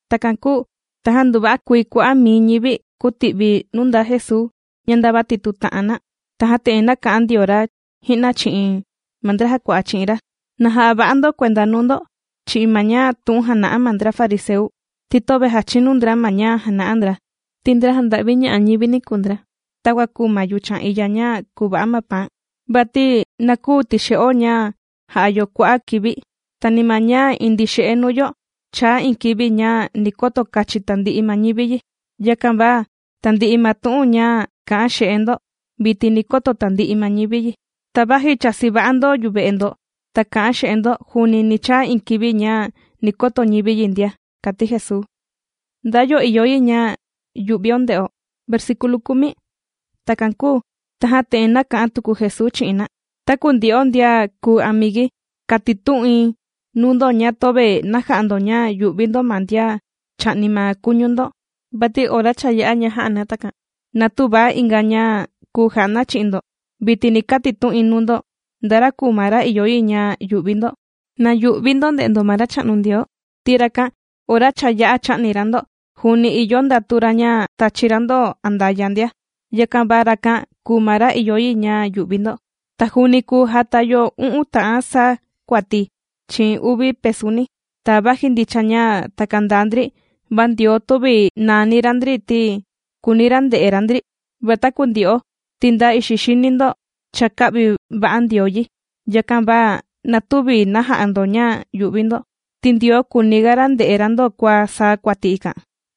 Takan kūu tajan nduva'a kuii kua'a' mii ñivi kūti'vi nuu ndaa Jesuu ña ndava tìtuta'an na. Tajan te'en nāka'an ndio ra ji'na chi'in ma ndra jàkua'a chi'in ra: ―Na ja'a va'a ndo kuenda nuu ndo chi'in ma tu'un ña jàna'a ma ndra fariseu, ti töve jàchinu ndra ma ña jàna'a ndra, ti ndra jànda'viña'a ñivini kùu ndra, takua kùu ma yuchan iya ña kuva'a ma paan. Vati na küu tixe'o ña jà'a yo kua'a' kivi, ta ni ma ña indii xe'e nuu yo chaa iin kivi ña ni koto kachin tandi'i ma ñivi yi. Yakan va tandi'i ma tu'un ña kā'an xe'e ndo, vitin ni koto tandi'i ma ñivi yi. Ta vaji chāsi va'a ndo yuve'e ndo ta kā'an xe'e ndo, juuni ni chaa iin kivi ña ni koto ñivi yi ndia ―kàti Jesuu. ¿Nda yo ìyo yi ña yu'vio nde'o? Takan kūu tajan te'en nāka'an tuku Jesuu chi'in na: ―Taku ndyo'o ndian kùu amigui kàtitu'in nuu ndo ña töve na ja'a ndo ña yù'vi ndo ma ndian chà'ni ma kuñu ndo, vati ora cha yā'a ña jà'a na takan, na tüva inga ña kùu ja'a na chi'in ndo. Vitin ni katitu'in nuu ndo nda ra kùu ma ra ìyo yi ña yu'vi ndo: na yu'vi ndo nde'e ndo ma Racha'nu Ndioo, ti rakan ora cha yā'a chā'ni ra ndo juuni ìyo ndatu ra ña tachi ra ndo andaya' ndia. Yakan va rakan kùu ma ra ìyo yi ña yu'vi ndo. Ta juuni kùu jata yo u'un ta'an saa kuati chi'in uvi pesuni, ta vaji ndicha ña takan ndaa ndri, va Ndioo tüvi nàani ra ndri ti kùuni ra nde'e ra ndri. Va taku ndyo'o ti nda ixi xini ndo cha kā'vi va'a Ndioo yi, yakan va na tüvi na ja'a ndo ña yù'vi ndo, ti Ndioo kùuniga ra nde'e ra ndo kua saa kuati ikan.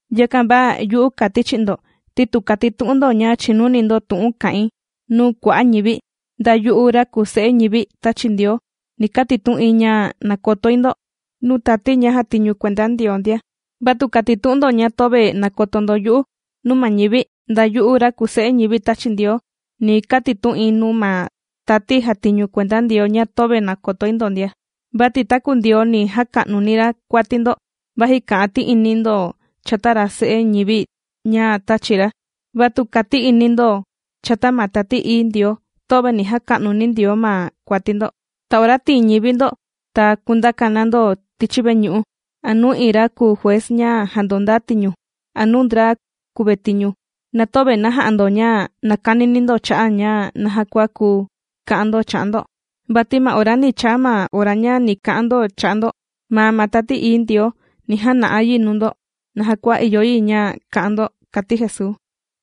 ’Yakan va yu'u kàti̱ chi'in ndo ti tu kàtitu'un ndo ña chìnuni ndo tu'un kà'in nuu kua'a' ñivi, nda yu'u ra kùu Se'e ñivi tāchi Ndioo ni katitu'in ña nàkotoi ndo nuu tati ña jàtiñu kuenda Ndioo ndia. Va tu kàtitu'un ndo ña töve nàkoto ndo yu'u nuu ma ñivi, nda yu'u ra kùu Se'e ñivi tāchi Ndioo, ni kukatitu'in nuu ma tati jàtiñu kuenda Ndioo ña töve nàkotoi ndo ndia. ’Vati taku Ndioo ni jaka'nuni ra kuati ndo vaji kà'an ti'ini ndo chata ra Se'e ñivi ña tāchi ra, va tu kàti'ini ndo chata ma Tati Ií Ndioo, töve ni jaka'nuni Ndioo ma kuati ndo. Ta ora tìin ñivi ndo ta kundaka na ndo tichi veñu'u a nuu iin ra kùu juez ña jàndondaa tiñu, a nuu ndra kùvetiñu, na töve na ja'a ndo ña nàkanini ndo cha'a' ña naja kua kuu ka'an ndo cha'a' ndo, vati ma ora ni chaa ma ora ña ni ka'an ndo cha'a' ndo, maa ma Tati Ií Ndioo, ni jana'a yi nuu ndo naja kua ìyo yi ña ka'an ndo ―kàti Jesuu.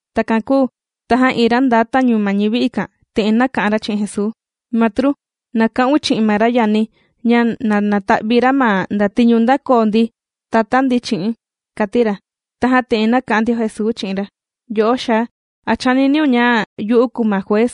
Takan kūu tajan iin ra nda tañu ma ñivi ikan te'en nāka'an ra chi'in Jesuu: ―Matru, na ka'un chi'in ma ra yani̱ ña na nata'vi ra ma ndatiñu ndākoo nditatá ndi chi'i̱n ―kàti ra. Tajan te'en nāka'an ndio Jesuu chi'in ra: ―Yo'o xaa, ¿a chàniniun ña yu'u kùu ma juez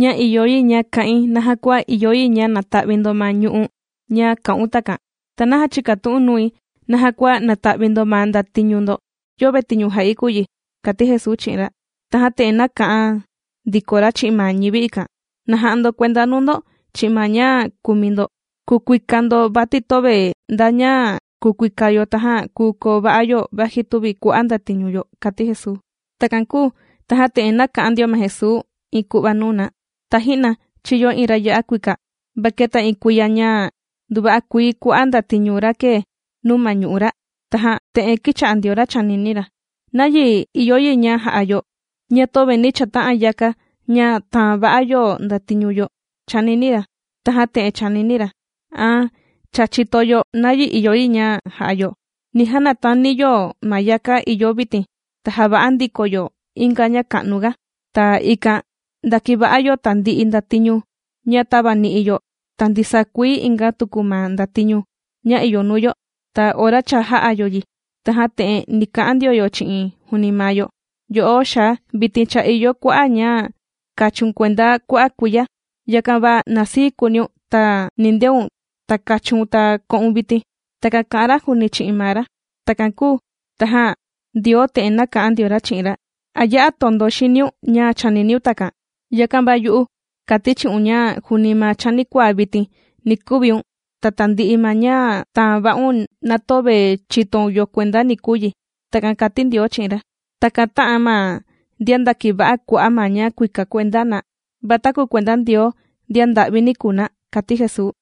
ña ìyo yi ña ka'in naja kua ìyo yi ña nata'vi ndo ma ñu'u' ña kā'un takan? ¿Ta naja chìkatu'u̱n nui naja kua nata'vi ndo ma ndatiñu ndo? Yöve tiñu jà'i kùu yi ―kàti Jesuu chi'in ra. Tajan te'en nāka'an ndiko ra chi'in ma ñivi ikan: ―Na ja'a ndo kuenda nuu ndo chi'in ma ña kùuni ndo kukuika ndo, vati töve nda ña kukuika yo tajan kùu koo va'a yo vaji tüvi kua'a' ndatiñu yo ―kàti Jesuu. Takan kūu tajan te'en nāka'an ndio ma Jesuu iin ku'va nuu na: ―Taji'na chīyo iin ra ya'a kuika, va keta iin kuiya ña nduva'a kuii kua'a' ndatiñu ra kēe nuu ma ñu'u' ra. Tajan te'en kīcha'a ndio ra chànini ra: “¿Nayi ìyo yi ña ja'a yo ña tüvi ni chata'an yaka ña tàan va'a yo ndatiñu yo?”, chànini ra. Tajan te'en chānini ra: “An cha chìto yo nayi ìyo yi ña ja'a yo. Ni janatani yo ma yaka ìyo vitin ta java'a ndiko yo inga ña ka'nu ga, ta ikan ndakiva'a yo tandi'i ndatiñu yo ña tavani'i yo ta ndisaa kuii inga tuku ma ndatiñu ña ìyo nuu yo.” Ta ora cha jā'a yo yi, tajan te'en ni ka'an ndio yo chi'in juuni maa yo: “Yo'o xaa vitin cha ìyo kua'a' ña kachiun kuenda kua'a' kuiya, yakan va na sii kuuniun ta nindeun ta kachiun ta ko'un vitin.” Takan kà'an ra juuni chi'in maa ra. Takan kūu tajan Ndioo te'en nāka'an ndio ra chi'in ra: “¿A ya'a tondo xiniun ña chàniniun takan? Yakan va yu'u kàti̱ chi'un ña juuni ma chanikuaa vitin ni kuviun, ta tandi'i ma ña tāan va'un na töve chìtoun yo kuenda ni kuu yi.” Takan kāti Ndioo chi'in ra. Takan tā'an ma ndian ndàkiva'a kua'a' ma ña kuika kuenda na, va taku kuenda Ndioo ndian nda'vini kùu na ―kàti Jesuu.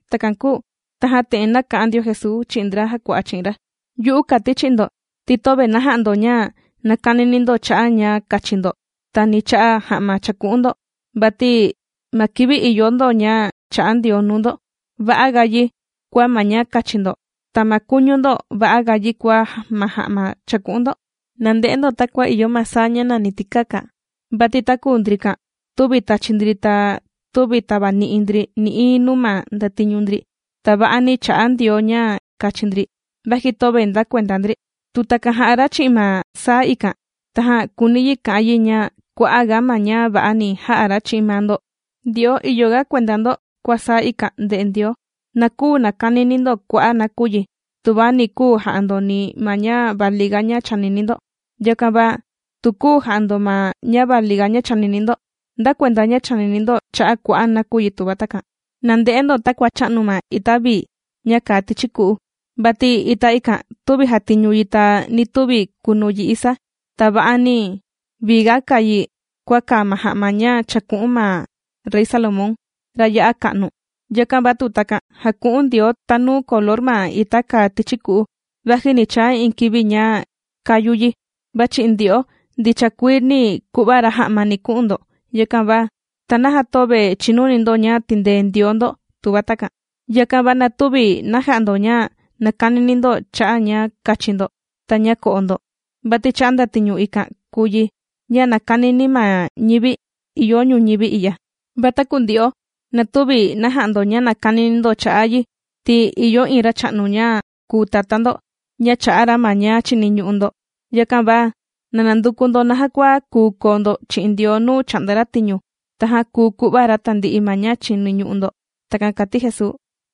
Takan kūu tajan te'en nāka'an ndio Jesuu chi'in ndra jàkua'a chi'in ra: ―Yu'u kàti̱ chi'in ndo ti töve na ja'a ndo ña nàkanini ndo cha'a' ña kachi ndo ta ni cha'a' ja'ma chàku'un ndo. Vati ma kivi ìyo ndo ña chā'a Ndioo nuu ndo, va'aga yi kua ma ña kachi ndo, ta ma kuñu ndo va'aga yi kua ma ja'ma chàku'un ndo. Na nde'e ndo takua ìyo ma saa ña nàni tikaka. Vati taku ndrikan tüvi tàchi ndri ta tüvi tavani'i ndri nï'iin nuu ma ndatiñu ndri, ta va'ani chà'a Ndioo ña kachi ndri vaji töve ndakuenda ndri. Tu takan jà'a ra chi'in ma saa ikan tajan kùuni yi ka'an yi ña kua'a' ga ma ña va'a ni ja'a ra chi'in maa ndo. Ndyo'o ìyo ga kuenda ndo kua saa ikan ndè'e Ndioo. Na küu nakanini ndo kua'a' nakuyi tuva ni küu ja'a ndo ni ma ña valiga ña chànini ndo. Yakan va, ¿tu küu ja'a ndo ma ña valiga ña chànini ndo, nda kuenda ña chànini ndo cha'a' kua'a' nakuyi tuva takan? ’Na nde'e ndo takua chà'nu ma ita vii ña kàa tichi ku'u. Vati ita ikan tüvi jàtiñu yi ta ni tüvi kùnu yi isa, ta va'ani vii ga kàa yi kua kàa ma ja'ma ña chāku'un ma Rey Salomón, ra ya'a ka'nu. Yakan va tu takan jàku'un Ndioo tanuu color ma ita kàa tichi ku'u vaji ni chaa iin kivi ña kàyu yi, va chi'in ndyo'o ndicha kuii ni ku'va ra ja'ma ni ku'un ndo. Yakan va, ¿ta naja töve chìnuni ndo ña tìndee Ndioo ndo tuva takan? Yakan va na tüvi na ja'a ndo ña nàkanini ndo cha'a' ña kachi ndo ta ña ko'o ndo. Vati cha'a' ndatiñu ikan kùu yi ña nàkanini ma ñivi ìyo ñuñivi i'ya. Va taku ndyo'o na tüvi na ja'a ndo ña nàkanini ndo cha'a' yi, ti ìyo iin Racha'nu ña kùu Tatá ndo ña chà'a ra ma ña chìniñu'u ndo. Yakan va na nanduku ndo naja kua kùu koo ndo chi'in Ndioo nuu chà'nda ra tiñu, tajan kuu ku'va ra tandi'i ma ña chìniñu'u ndo. ―Takan kàti Jesuu.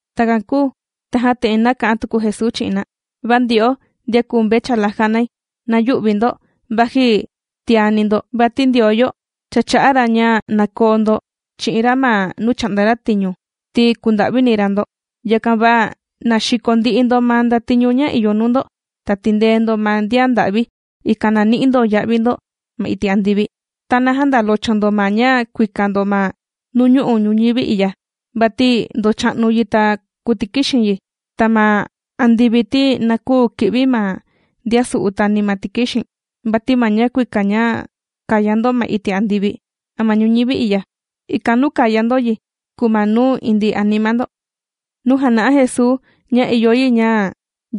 Takan kūu tajan te'en nāka'an tuku Jesuu chi'in na: ―Va ndyo'o ndian kùu mvechala jànai, na yü'vi ndo vaji tiani ndo, vati Ndioo yo cha chā'a ra ña na koo ndo chi'in ra ma nuu chà'nda ra tiñu ti kùnda'vini ra ndo. Yakan va na xiko ndi'i ndo ma ndatiñu ña ìyo nuu ndo, ta tìndee ndo ma ndian nda'vi, ikan na ni'i ndo ya'vi ndo ma iti' andivi. Ta na jändolocho ndo ma ña kuika ndo ma nuñu'u' ñuñivi i'ya, vati ndòcha'nu yi ta kùtikixin yi. Ta ma andivi ti na küu ki'vi ma ndian su'u ta ni ma tikixin. Vati ma ña kuika ña kàya ndo ma iti' andivi a ma ñuñivi i'ya, ikan nuu kàya ndo yi kùu ma nuu indii anima ndo. Nuu jàna'a Jesuu ña ìyo yi ña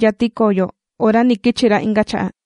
yati koo yo ora ni kichi ra inga cha'a'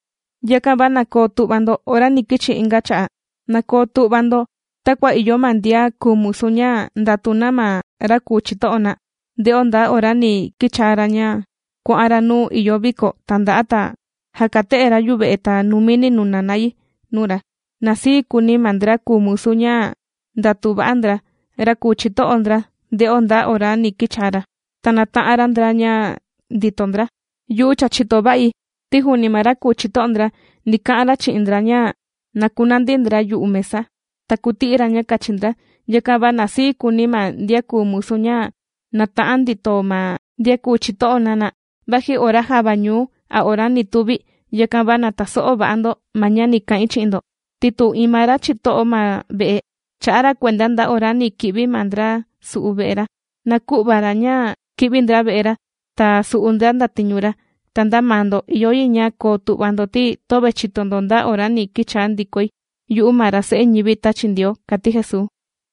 ’Yakan va na koo tu'va ndo ora ni kichi̱ inga cha'a'. Na koo tu'va ndo takua ìyo ma ndian kùu musu ña ndàtu na ma ra kùu chito'o na, nde'o nda ora ni kichaa ra ña kuà'an ra nuu ìyo viko tanda'a, ta jakate'e ra yuve'e, ta numini nuna na yi nuu ra. Na sii kuuni ma ndra kùu musu ña ndàtu va'a ndra, ra kùu chito'o ndra nde'o nda ora ni kichaa ra, ta nàta'an ra ndra ña ndito ndra. Yu'u cha chìto va'i ti juuni ma ra kùu chito'o ndra ni ka'an ra chi'in ndra ña na kunandi ndra yu'u mesa, ta kuti'i ra ña kachi ndra. Yakan va na sii kuuni ma ndian kùu musu ña nàta'an ndito ma ndian kùu chito'o na na, vaji ora java ñuu a ora ni tuvi. Yakan va na taso'o va'a ndo ma ña ni ka'in chi'in ndo, ti tu iin ma ra chito'o ma ve'e chà'a ra kuenda nda ora ni ki'vi ma ndra su'u ve'e ra, na kü'va ra ña ki'vi ndra ve'e ra, ta su'u ndra ndatiñu ra. Ta nda maa ndo ìyo yi ña koo tu'va ndo ti töve chìto ndo nda ora ni kichaa ndikoi yu'u ma ra Se'e ñivi tāchi Ndioo ―kàti Jesuu.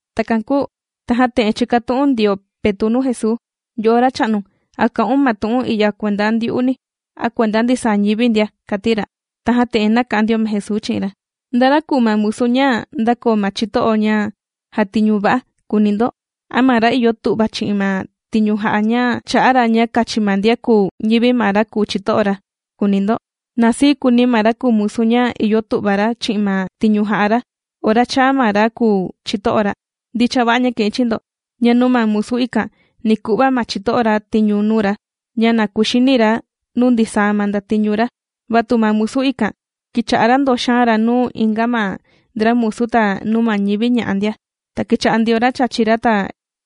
Takan kūu tajan te'en chīkatu'un ndio Petu' nuu Jesuu: ―Yo'o Racha'nu, ¿a kà'un ma tu'un i'ya kuenda ndyu'uni a kuenda ndisaa ñivi ndia? ―kàti ra. Tajan te'en nāka'an ndio ma Jesuu chi'in ra: ―¿Nda ra kùu ma musu ña ndàkoo ma chito'o ña jàtiñu va'a?, kùuni ndo, ¿a ma ra ìyo tu'va chi'in ma tiñu jà'a ña chà'a ra ña kachi ma ndian kùu ñivi ma ra kùu chito'o ra?, kùuni ndo. Na sii kuuni ma ra kùu musu ña ìyo tu'va ra chi'in ma tiñu jà'a ra ora chàa ma ra kùu chito'o ra. Ndicha va'a ña kà'in chi'in ndo, ña nuu ma musu ikan ni ku'va ma chito'o ra tiñu nuu ra ña na kuxini ra nuu ndisaa ma ndatiñu ra. Va tu ma musu ikan kīcha'a ra ndòxaan ra nuu inga ma ndra musu ta nuu ma ñivi ña'a ndia. Ta kīcha'a ndio ra chàchi ra ta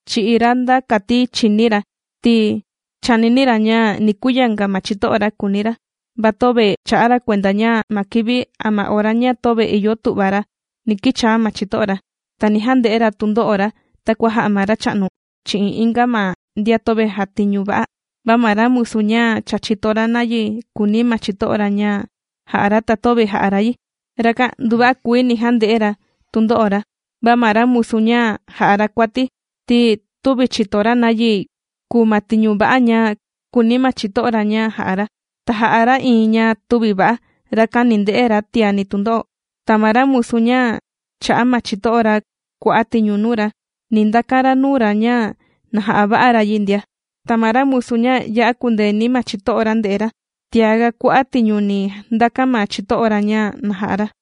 chì'i ra nda kati chìní ra ti chànini ra ña ni kuyanga ma chito'o ra, kùuni ra. Va töve chā'a ra kuenda ña ma kivi a ma ora ña töve ìyo tu'va ra ni kichaa ma chito'o ra, ta ni jande'e ra tundo'o ra, takua jà'a ma Racha'nu chi'in inga ma ndian töve jàtiñu va'a. Va ma ra musu ña cha chìto ra nayi kùuni ma chito'o ra ña jà'a ra ta töve jà'a ra yi, rakan nduva'a kuii ni jande'e ra tundo'o ra. Va ma ra musu ña jà'a ra kuati ti tüvi chìto ra nayi kùu ma tiñu va'a ña kùuni ma chito'o ra ña jà'a ra, ta jà'a ra iin ña tüvi va'a, rakan ni nde'e ra tiani tundo'o. Ta ma ra musu ña chà'a ma chito'o ra kua'a' tiñu nuu ra ni ndakan ra nuu ra ña na ja'a va'a ra yi ndia. Ta ma ra musu ña ya'a kūndeeni ma chito'o ra ndè'e ra, tiaga kua'a' tiñu ni ndakan ma chito'o ra ña na ja'a ra.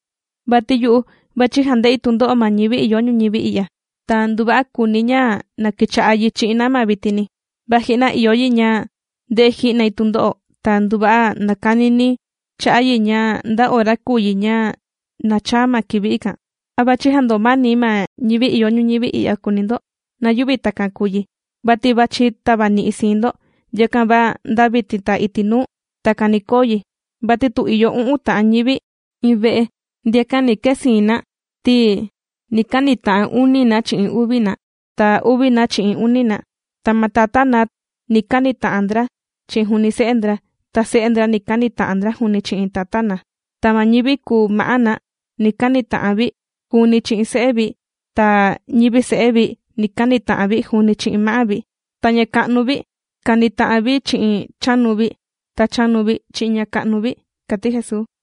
’Vati yu'u vàchi jande'i tundo'o ma ñivi ìyo ñuñivi i'ya, ta nduva'a kùuni̱ ña na kicha'a yi chi'in na ma vitini. Va ji'na ìyo yi ña nde'e ji'nai tundo'o ta nduva'a nàkanini̱ cha'a' yi ña nda ora kùu yi ña na chaa ma kivi ikan. ¿A vàchi jandomani̱ ma ñivi ìyo ñuñivi i'ya?, kùuni ndo. Na yüvi takan kùu yi, vati vàchi tavani'i̱ siin ndo. Yakan va nda vitin ta iti' nuu, takan ni koo yi: vati tu ìyo u'un ta'an ñivi iin ve'e, ndiakan ni kee siin na ti ni kanita'an uni na chi'in uvi na, ta uvi na chi'in uni na. Ta ma tatá na ni kanita'an ndra chi'in juuni se'e ndra, ta se'e ndra ni kanita'an na juuni chi'in tatá na. Ta ma ñivi kùu ma'á na ni kanita'an vi juuni chi'in se'e vi ta ñivi se'e vi ni kanita'an vi juuni chi'in ma'á vi. Ta ña ka'nu vi kanita'an vi chi'in chanu vi, ta chanu vi chi'in ña ka'nu vi ―kàti Jesuu.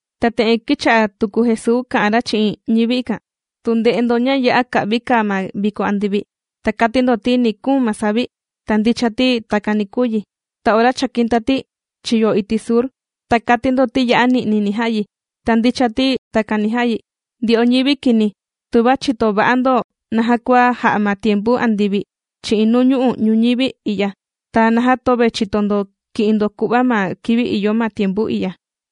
Ta te'en kīcha'a tuku Jesuu kà'an ra chi'in ñivi ikan: ―Tu nde'e ndo ña ya'a ka'vi kàa ma viko andivi, ta kati ndo ti ni kuun ma savi, ta ndicha ti takan ni kuu yi. Ta ora chàkin tati chiyo iti' sur, ta kàti ndo ti ya'a ni'ni ni ja'a yi, ta ndicha ti takan ni ja'a yi. Ndyo'o ñivi kini, tuva chìto va'a ndo naja kua jà'a ma tiempu andivi chi'in nuu ñu'u' ñuñivi i'ya, ¿ta naja töve chìto ndo kì'in ndo ku'va ma kivi ìyo ma tiempu i'ya?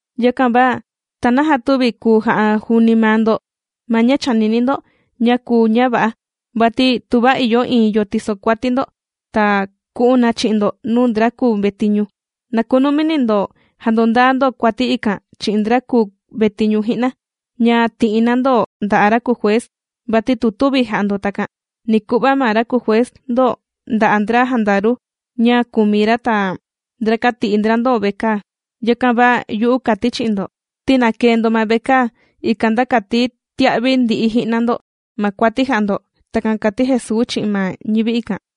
’Yakan va, ¿ta naja tüvi kùu ja'a juuni maa ndo ma ña chànini ndo ña kùu ña va'a? Vati tuva ìyo iin yo tìsokuati ndo, ta ku'un na chi'in ndo nuu ndra kùu vetiñu, na kunumi ndo jandondaa ndo kuati ikan chi'in ndra kùu vetiñu ji'na, ña ti'i na ndo nda'a' ra kùu juez, vati tu tüvi ja'a ndo takan, ni ku'va ma ra kùu juez ndo nda'a' ndra jandaru ña kùmi ra, ta ndrakan tì'i ndra ndo vekaa. Yakan va yu'u kàti̱ chi'in ndo ti na këe ndo ma vekaa ikan, nda kati tia'vi ndi'i ji'na ndo ma kuati jā'a ndo. ―Takan kàti Jesuu chi'in ma ñivi ikan.